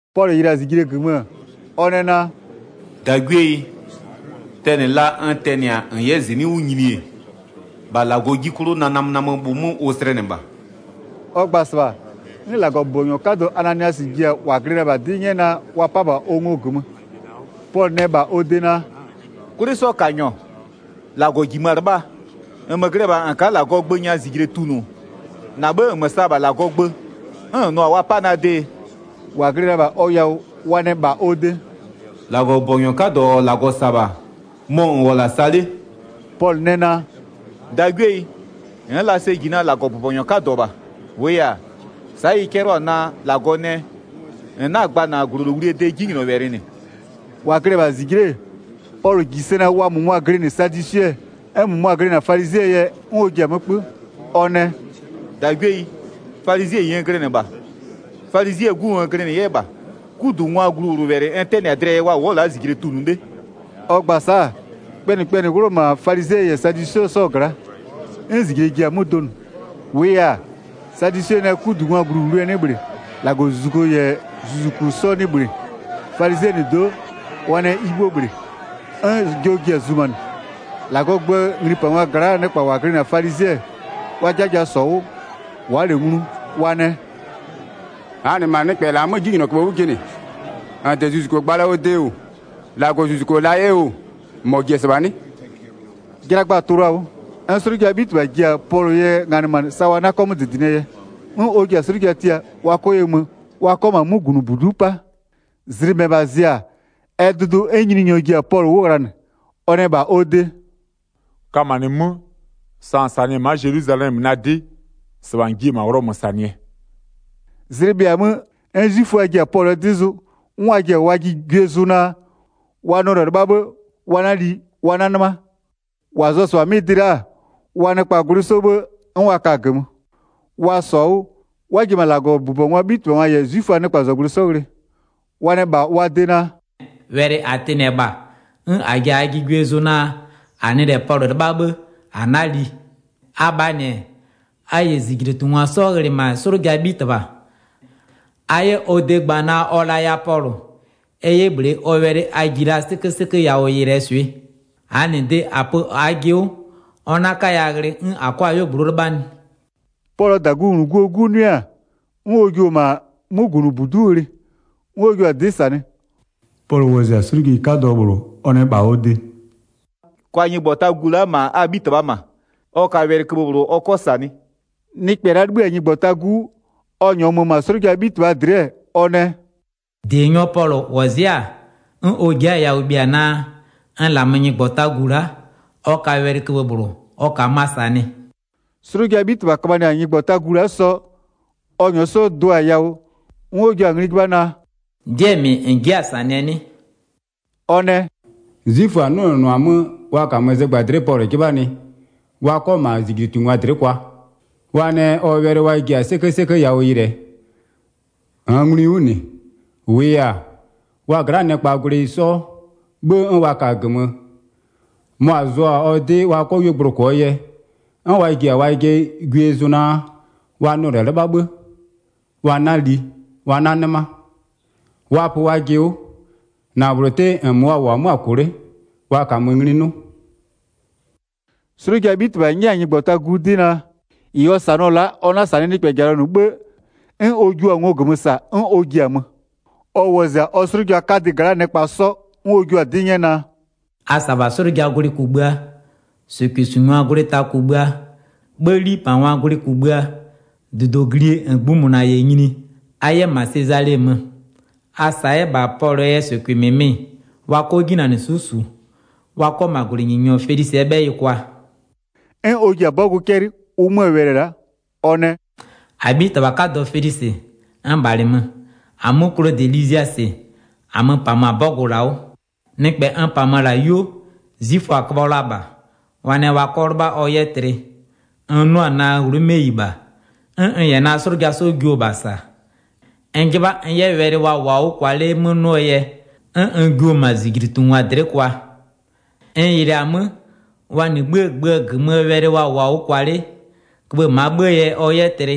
Pɔlʋ yɩlɩ-a -zijle -gömö, ɔ nɛ naa: “-Dagwieyi, tɛnɩ la n tɛnɩ-a -n 'yɛ -zɩnɩ'ɩ 'wʋ nyini-e, -bha -Lagɔɔ 'ji 'klʋ na namönamöbhʋ 'mö ʋ slɛnɩ -bha.” Ɔ gba-a -sɩbha, 'n -Lagɔbʋbɔnyɔ 'kadɔ Ananiasɩ ji-a -wa glɩ la-a -bha ɔ yawʋ 'dɩ 'nyɛ naa, wa 'pa -bha ɔ ngo -gömö. Pɔlʋ nɛ -bha ɔ de naa: “'Kwlɩsɔkanyɔ, -Lagɔ -jimö-a 'lɩbhaa, -nmö glɩ-ɛ -bha -n ka'a -Lagɔɔ gbö nya -zijle tunʋ, -na 'bhë -nmö sa-a -bha -Lagɔɔ gbö, 'n -n nʋ-a wa 'pa na dee?” 4-Wa glɩ la-a -bha ɔ yawʋ, wa nɛ -bha ɔ de: “-Lagɔbʋbɔnyɔ 'kadɔ -ɔ -Lagɔ -sa-a -bha, mɔ -n -wʋ-ɔ -la sa 'le!” Pɔlʋ nɛ naa: “-Dagwieyi, n'n la sɛ -ji naa -Lagɔbʋbɔnyɔ 'kadɔ -bha, -wʋʋ yɛ-a, sa'a ɩ 'cɛlɩɔ-a naa: -Lagɔ nɛ: -N 'na-a gba -na -glolowlie de 'jinylɔwɛlɩ -nɩ.” 6-Wa glɩ-ɛ -bha -zijle'e, Pɔlʋ -ji sɛ naa wa -mʋmʋa glɩnɩ sadwisɩɛ, 'n -mʋmʋa glɩnɩ-a falizɩɛɛ yɛ 'n ɔ ji-a 'mö 'kpö, ɔ nɛ: “-Dagwieyi, falizɩɛyi n glɩnɩ -bha, falizɩɛ 'gu n glɩnɩ 'yɛ -bha. 'Kudungwaa gluwlʋwɛlɩ n 'tɛnɩ-a dlɩɛ yɛ wa wʋ'ʋ-ɔ la'a -zijle tunʋ 'le.” Ɔ gba-a sa'a, kpɛnɩkpɛnɩɛ 'wlʋ-ɔ -ma falizɩɛ -yɛ sadwisɩɛ 'sɔɔ gla'a. 'N -zijle ji-a 'mö donʋ. 8-Wʋʋ yɛ-a, sadwisɩɛ nɛ 'kudungwaa gluwlʋwlʋɛ 'nɩ -bhlɩ, -Lagɔzuzuku -yɛ zuzuku 'sɔ 'nɩ 'yɛ -bhlɩ, falizɩɛ -nɩ do'o wa nɛ ɩ 'bhuo -bhlɩ. 'N jɔ ji-a zumanɩ, -Lagɔɔ gböö nglipangwa gla'aa nɩkpa -wa glɩnɩ-a falizɩɛ, wa 'jaja -sɔ-a 'wʋ, wa'a -lɛ nglu, wa nɛ: “-Aa -nɩ -ma nɩkpɛ -la 'mö 'jinylɔköbhë 'wʋ jɩnɩ. -N -de zuzuko gba la ɔ de oo, -Lagɔzuzuko 'yɛ la oo, -mɔ -ji-e -sɩbha 'nɩ?” Jlagba-a tʋ-ʋ la-a 'wʋ. 'N 'slʋjaa 'bhitɩbha ji-a Pɔlʋɔ yɛ nganɩmanɩ sa wa 'na 'kɔ 'mö -dɩdɩnɩɛ yɛ. 'N ɔ ji-a 'slʋja tia, wa 'kɔ ye mö, wa 'kɔ -ma 'mögunʋbudu'u 'pa. Zlɩ -mɛbha zɩ-a, ɛ dʋdʋ 'n Nyininyɔ ji-a Pɔlʋ 'wʋ ghlanɩ. Ɔ nɛ -bha ɔ de: “Kamanɩ 'mö, sa -n -sanɩ-ɛ ma'a Zelwizalɛmö na 'dɩ, -sɩbha -n jiɩ-e -ma Ghlɔmö -sanɩɛ.” Zlɩ bhɩa-a 'mö, 'n 'zwiföa ji-a Pɔlʋɔ 'dɩ zʋ, 'n wa ji-a wajɩ gwie zʋ naa, wa nɩɔ -lɛ 'lɩbha 'bhë wa 'na li, wa 'na 'nɩma. 13-Wa zʋ-ɔ -sɩbha 'mɩ dɩ la'a, wa nɩkpaa -gwlɩ 'sɔ 'bhë 'n wa ka-a -gömö. Wa -sɔ-a 'wʋ, 'n wa ji-e -ma -Lagɔbʋbɔngwaa 'bhitɩbhangwa -yɛ 'zwiföaa nɩkpazɔgblʋɩ 'sɔ ghlɩ. Wa nɛ -bha wa de naa: “Wɛlɩ -a tɩnɩ-ɛ -bha 'n -a ji-a -aajɩ gwie zʋ naa, -a nɩ -lɛ Pɔlʋ 'lɩbha 'bhë -a 'na li. Abhaa -nɩ-ɛ, a -yɛ -zijlitungwa 'sɔ ghlɩ -ma 'slʋjaa 'bhitɩbha, a 'yɛ ɔ de gba naa ɔ laya Pɔlʋ, ɛ 'yɛ -bhlee ɔ wɛlɩ a ji la 'sɩkösɩkö yawʋ yɩlɩɛ swɩ. -Aa -nɩ de -a pö -aajɩ 'wʋ, ɔ 'na 'kaya ghlɩ 'n -a 'kɔ-a 'yuogblʋ'ʋ 'lɩbhanɩ.” Pɔlʋɔ -dagungluguo 'gu 'nʋɩ-a, 'n ɔ jio-o -ma 'mögunʋbudu'u ghlɩ, 'n ɔ jio-a 'dɩ -sanɩ. Pɔlʋ wɔzɩ-a 'slʋjeyi 'kadɔ -bhlʋ, ɔ nɛ -bha ɔ de: “Kwa nyɩgbɔtagu la'a -ma a 'bhitɩbhaa -ma, ɔ ka wɛlɩköbhë -bhlʋ ɔ 'kɔ -sanɩ.” Nɩkpɛ la'a 'libhï-a nyɩgbɔtagu 'wʋ, ɔ -nyɔɔ mö-ö -ma 'slʋjaa 'bhitɩbha dlɩ'ɩ-ɛ, ɔ nɛ: “-Dienyɔ Pɔlʋ -wɔzɩ'ɩ-a 'n ɔ ji'i-a yawʋ bhia naa, n -lamö nyɩgbɔtagu la'a, ɔ ka wɛlɩköbhë -bhlʋ ɔ -kamöa -sanɩ.” 'Slʋjaa 'bhitɩbha köbhanɩ-a nyɩgbɔtagu la'a sɔ, ɔ -nyɔɔ 'sɔ do-a yawʋ, 'n ɔ jio-a ngli 'jɩbha naa: “'Dɩɛ -mɩ -n ji'i-a -sanɩɛ 'nɩ?” Ɔ nɛ: “'Zwiföa-a 'nʋnʋnʋ-a 'mö wa -kamö zɩgbadlɩ'ɩ Pɔlʋ 'jɩbhanɩ wa 'kɔ -ma -zijlitungwa dlɩ'ɩ kwa, wa nɛ ɔ wɛlɩ wa ji-a 'sɩkösɩkö yawʋ yɩlɩɛ. 21-Nn nglui 'wʋ -nɩ, -wʋʋ yɛ-a, wa gla'aa nɩkpaa gwlɩ 'sɔ 'bhë 'n wa ka-a -gömö, mʋa-a zʋ-a ɔ 'dɩ wa 'kɔ 'yuogblʋ -kʋɔ yɛ, 'n wa ji-a wajɩ gwie zʋ naa wa nɩɔ -lɛ 'lɩbha 'bhë, wa 'na li wa 'na 'nɩma. Wa pö wajɩ 'wʋ, -na -bhlʋ 'tɩ -nmö wa -wʋ-ɔ 'mö-a -kʋ 'le wa -kamö ngli 'nʋ.” 'Slʋjaa 'bhitɩbha 'nyɛ-a nyɩgbɔtagu 'dɩ naa, -ɩ ɔ -sanɩɔ-ɔ la'a ɔ 'na-a -sanɩɩ nɩkpɛjalɔ -nɩ 'bhë, 'n ɔ jio-a ngo -gömö -sa 'n ɔ ji-a mö. Ɔ wɔzɩ-a ɔ 'slʋja 'kadɩ gla'aa nɩkpa 'sɔ, 'n ɔ jua-a 'dɩ 'nyɛ naa: “A -sa -bha 'slʋjaa gwlɩ kugbïa, -sʋkʋɩsungwaa gwlɩ ta kugbïa, 'bhë 'lipangwaa gwlɩ kugbïa, -dudoglie -ngbïmʋna -yɛ nyini-e, a 'yɛ -ma Sezale mö. A -sa 'yɛ -bha Pɔlʋɔ yɛ -sʋkʋɩ -mɩmɩ wa 'kɔ 'jinanɩswɩ'ɩ -su, wa 'kɔ -ma -gwlɩnyininyɔ Felisɩɛ 'bhɛyɩ kwa.” 'N ɔ ji-a 'bɔgʋ 'cɛlɩ, ʋ 'möö wɛlɩ-ɛ la'a. Ɔ nɛ: “-Abhitɩbha 'kadɔ Felisɩ n -bhalɩmö. -Amö Klodɩ Liziasɩ, -amö-ö -pamö-a 'bɔgʋ la'a 'wʋ. Nɩkpɛ n -pamö-ö -la 'yuo, 'zwiföa-a köbhɔ la -bha. Wa nɛ wa 'kɔ 'lɩbha ɔ 'yɛ tlɩ. N 'nʋ-a naa Ghlomeyi -bha, 'n n -yɛ na 'slʋja 'sɔ jio-o -bha -sa. N 'jɩbha n 'yɛ wɛlɩ wa -wʋɔ-a 'wʋ kwa 'le 'mö 'nʋɔ yɛ, 'n n jio-o -ma wa -zijlitungwa dlɩ'ɩ kwa. N yɩlɩɩ-a 'mö, wa -nɩ 'bhïë gbö -gömöö wɛlɩ wa -wʋɔ-a 'wʋ kwa 'le, köbhë -maa 'bhëë yɛ ɔ 'yɛ tlɩ,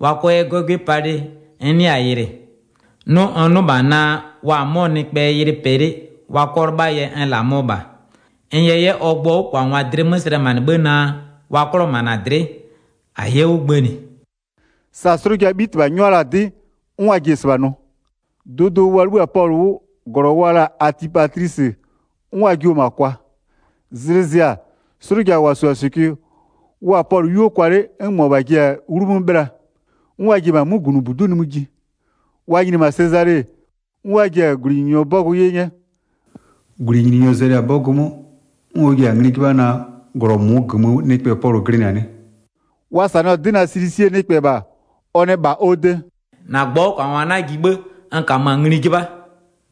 wa 'kɔ 'yɛ 'gɔgwɩ palɩ n 'nɩa-a yɩlɩ. 'Nʋ n 'nʋ -bha naa wa-a 'mɔ nɩkpɛɛ yɩlɩ pɛ 'le wa 'kɔ 'lɩbhaa yɛ n -lamöɔ -bha. N yɛ 'yɛ ɔ gbʋɔ 'wʋkwangwa dlɩ 'mö slɛmanɩ 'bhë naa wa 'klɔ -ma -na dlɩ'ɩ. -A 'yɛ 'wʋ gbënɩ.” Sa 'slʋjaa 'bhitɩbha 'nyʋa la-a 'dɩ, 'n wa ji-e -sɩbha nʋ. Dʋdʋ, wa 'libhï-a Pɔlʋ 'wʋ, -glɔ wa la-a Atipatlisɩ, 'n wa jio-o -ma kwa. Zlɩ zɩ-a, 'slʋja -wa -su-a -sʋkʋɩ, wa-a Pɔlʋ 'yuo kwa 'le 'n -mʋabha ji-a 'wlu 'mö 'bhɩla, 'n wa ji-e -ma 'mögunʋbudu'u nimï ji. Wa nyini-e -ma Sezale, 'n wa ji-a -gwlɩnyininyɔ 'bɔgʋ 'ye 'nyɛ, 'n wa jio 'yɛ-a Pɔlʋ 'ji tuluanɩ. 34-Gwlɩnyininyɔ zɛlɩ-a 'bɔgʋ 'mö, 'n ɔ ji-a ngli 'jɩbha naa, -glɔ -mʋʋ -gömöö nɩkpɛ Pɔlʋ glɩnɩ-a 'nɩ? Wa -sanɩɔ-a 'dɩ naa Silisie nɩkpɛ -bha-a, ɔ nɛ -bha ɔ de: “-Na gbʋɔ 'wʋkwangwa 'na ji 'bhë n -kamö-a ngli 'jɩbha.”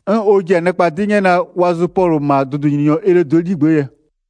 'N ɔ ji-a nɩkpa 'dɩ 'nyɛ naa wa zʋ Pɔlʋ -ma dʋdʋnyininyɔ Elodɩɛ 'ligbë'ë yɛ.